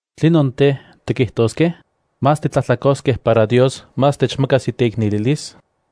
¿Tlinon tej, tikijtoskej? ¿Más titlajtlakoskej para Dios más techmakas iteiknelilis?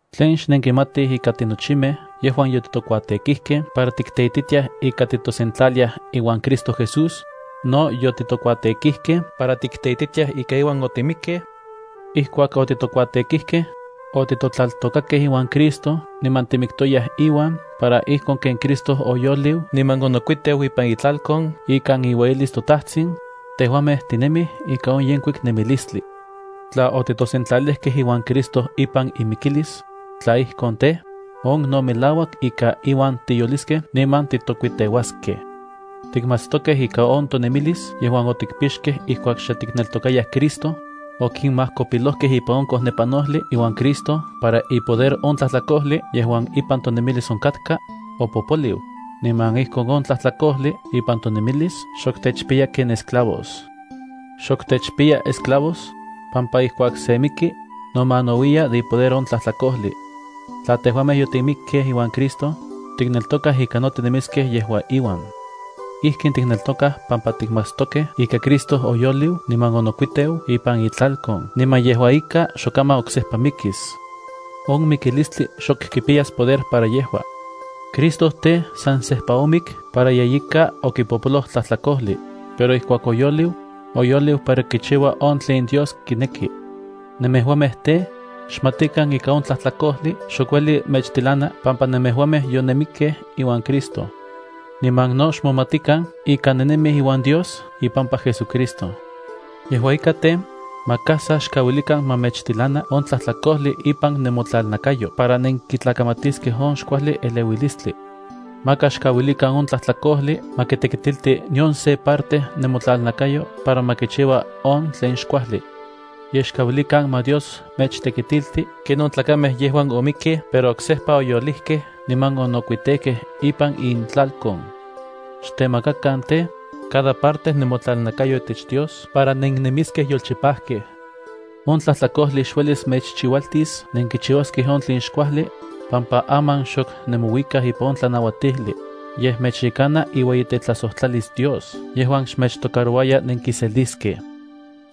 ¿Tlen xnenkimatij ika tinochimej yejuan yotitokuatekijkej para tikteititiaj ika titosentlaliaj iuan Cristo Jesús, no yotitokuatekijkej para tikteititiaj ika iuan otimikej? Ijkuak otitokuatekijkej, otitotlaltokakej iuan Cristo niman timiktoyaj iuan, para ijkon ken Cristo oyoliu niman onokuiteu ipan itlalkon ikan iueyilis toTajtsin, tejuamej tinemij ika on yenkuik nemilistli. Tla otitosentlalijkej iuan Cristo ipan imikilis, tla ijkon tej, on no melauak ika iuan tiyoliskej niman titokuiteuaskej. Tikmatstokej ika on tonemilis yejuan otikpixkej ijkuak xe tikneltokayaj Cristo, okinmajkopilojkej ipan on kojnepanojli iuan Cristo para ipoder on tlajtlakojli yejuan ipan tonemilis onkatka, opopoliu, niman ijkon on tlajtlakojli ipan tonemilis xok techpiya ken esclavos. Xok techpiya esclavos, pampa ijkuak se miki, nomanauiya de ipoder on tlajtlakojli. Tla tejuamej yotimikkej iuan Cristo, tikneltokaj ika no tinemiskej yejua iuan. Ijkin tikneltokaj pampa tikmatstokej ika Cristo oyoliu niman onokuiteu ipan itlalkon niman yejua ika xokaman oksejpa mikis. On mikilistli xok kipiyas poder para yejua. Cristo tej, san sejpa omik para yeyika okipojpoloj tlajtlakojli, pero ijkuak oyoliu, oyoliu para kichiua on tlen Dios kineki. Nemejuamej tej, xmatikan ika on tlajtlakojli xok ueli mechtilana pampa nemejuamej yonenmikkej iuan Cristo. Niman no xmomatikan ika nenemij iuan Dios ipampa JesuCristo. Yejua ika tej, maka sa xkauilikan ma mechtilana on tlajtlakojli ipan nemotlalnakayo para nenkitlakamatiskej on xkuajli eleuilistli. Maka xkauilikan on tlajtlakojli ma kitekitilti nion se parte nemotlalnakayo para ma kichiua on tlen xkuajli. Yej xkauilikan ma Dios mechtekitilti ken on tlakamej yejuan omikkej pero oksejpa oyolijkej niman onokuitejkej ipan intlalkon. Xtemakakan tej, cada parte nemotlalnakayo itech Dios para nenemiskej yolchipajkej. On tlajtlakojli xuelis mechchiualtis nenkichiuaskej on tlen xkuajli, pampa aman xok nemouikaj ipan on tlanauatijli, yej mechyekana iueyitetlajsojtlalis Dios yejuan xmechtocarouaya nenkiseliskej.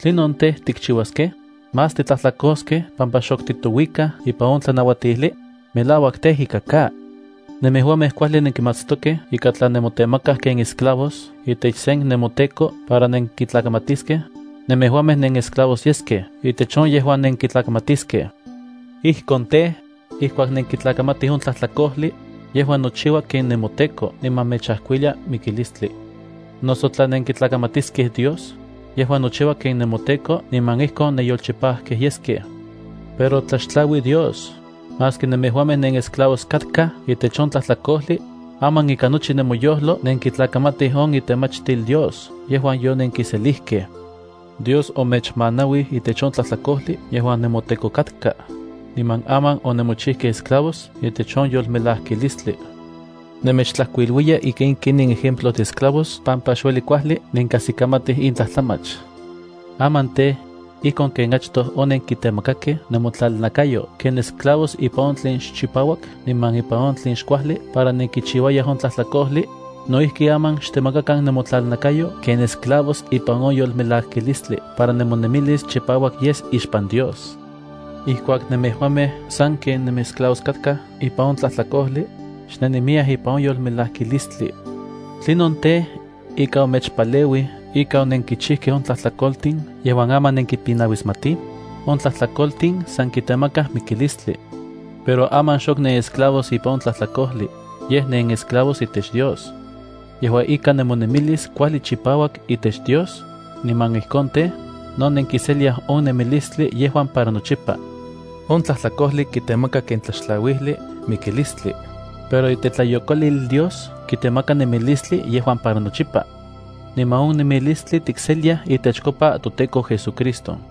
¿Tlinon tej, tikchiuaskej? ¿Más titlajtlakoskej pampa xok titouikaj ipan on tlanauatijli? ¡Melauak tej ika ka! Nemejuamej kuajli nenkimatstokej ika tla nemotemakaj ken esclavos itech sen nemoteko para nenkitlakamatiskej, nemejuamej nenesclavos yeskej itech on yejuan nenkitlakamatiskej. Ijkon tej, ijkuak nenkitlakamatij on tlajtlakojli, yejua nochiua ken nemoteko niman mechajkuilia mikilistli. Noso tla nenkitlakamatiskej Dios, yejua nochiua ken nemoteko niman ijkon nenyolchipajkej yeskej. Pero tlaxtlaui Dios, maski nemejuamej nenesclavos katkaj itech on tlajtlakojli, aman ikan nochi nemoyojlo nenkitlakamatij on itemachtil Dios yejuan yonenkiselijkej. Dios omechmanauij itech on tlajtlakojli yejuan nemoteko katka, niman aman onemochijkej esclavos itech on yolmelajkilistli. Nemechtlajkuiluiya ika in ken in ejemplos de esclavos pampa xueli kuajli nenkajsikamatij in tlajtlamach. Aman tej, ijkon ken achtoj onenkitemakakej nemotlalnakayo ken esclavos ipan on tlen xchipauak niman ipan on tlen xkuajli para nenkichiuayaj on tlajtlakojli, no ijki aman xtemakakan nemotlalnakayo ken esclavos ipan on yolmelajkilistli para nemonemilis chipauak yes ixpan Dios. Ijkuak nemejuamej sanken nenesclavos katkaj ipan on tlajtlakojli, xnennemiyaj ipan on yolmelajkilistli. ¿Tlinon tej, ika omechpaleuij ika onenkichijkej on tlajtlakoltin yejuan aman nenkipinauismatij? On tlajtlakoltin san kitemakaj mikilistli. Pero aman xok nenesclavos ipan on tlajtlakojli, yej nenesclavos itech Dios. Yejua ika nemonemilis kuajli chipauak itech Dios, niman ijkon tej, no nenkiseliaj on nemilistli yejuan para nochipa. On tlajtlakojli kitemaka ken tlaxtlauijli mikilistli, pero itetlayokolil Dios kitemaka nemilistli yejuan para nochipa. Niman on nemilistli tikseliaj itechkopa toTEKO JesúCristo.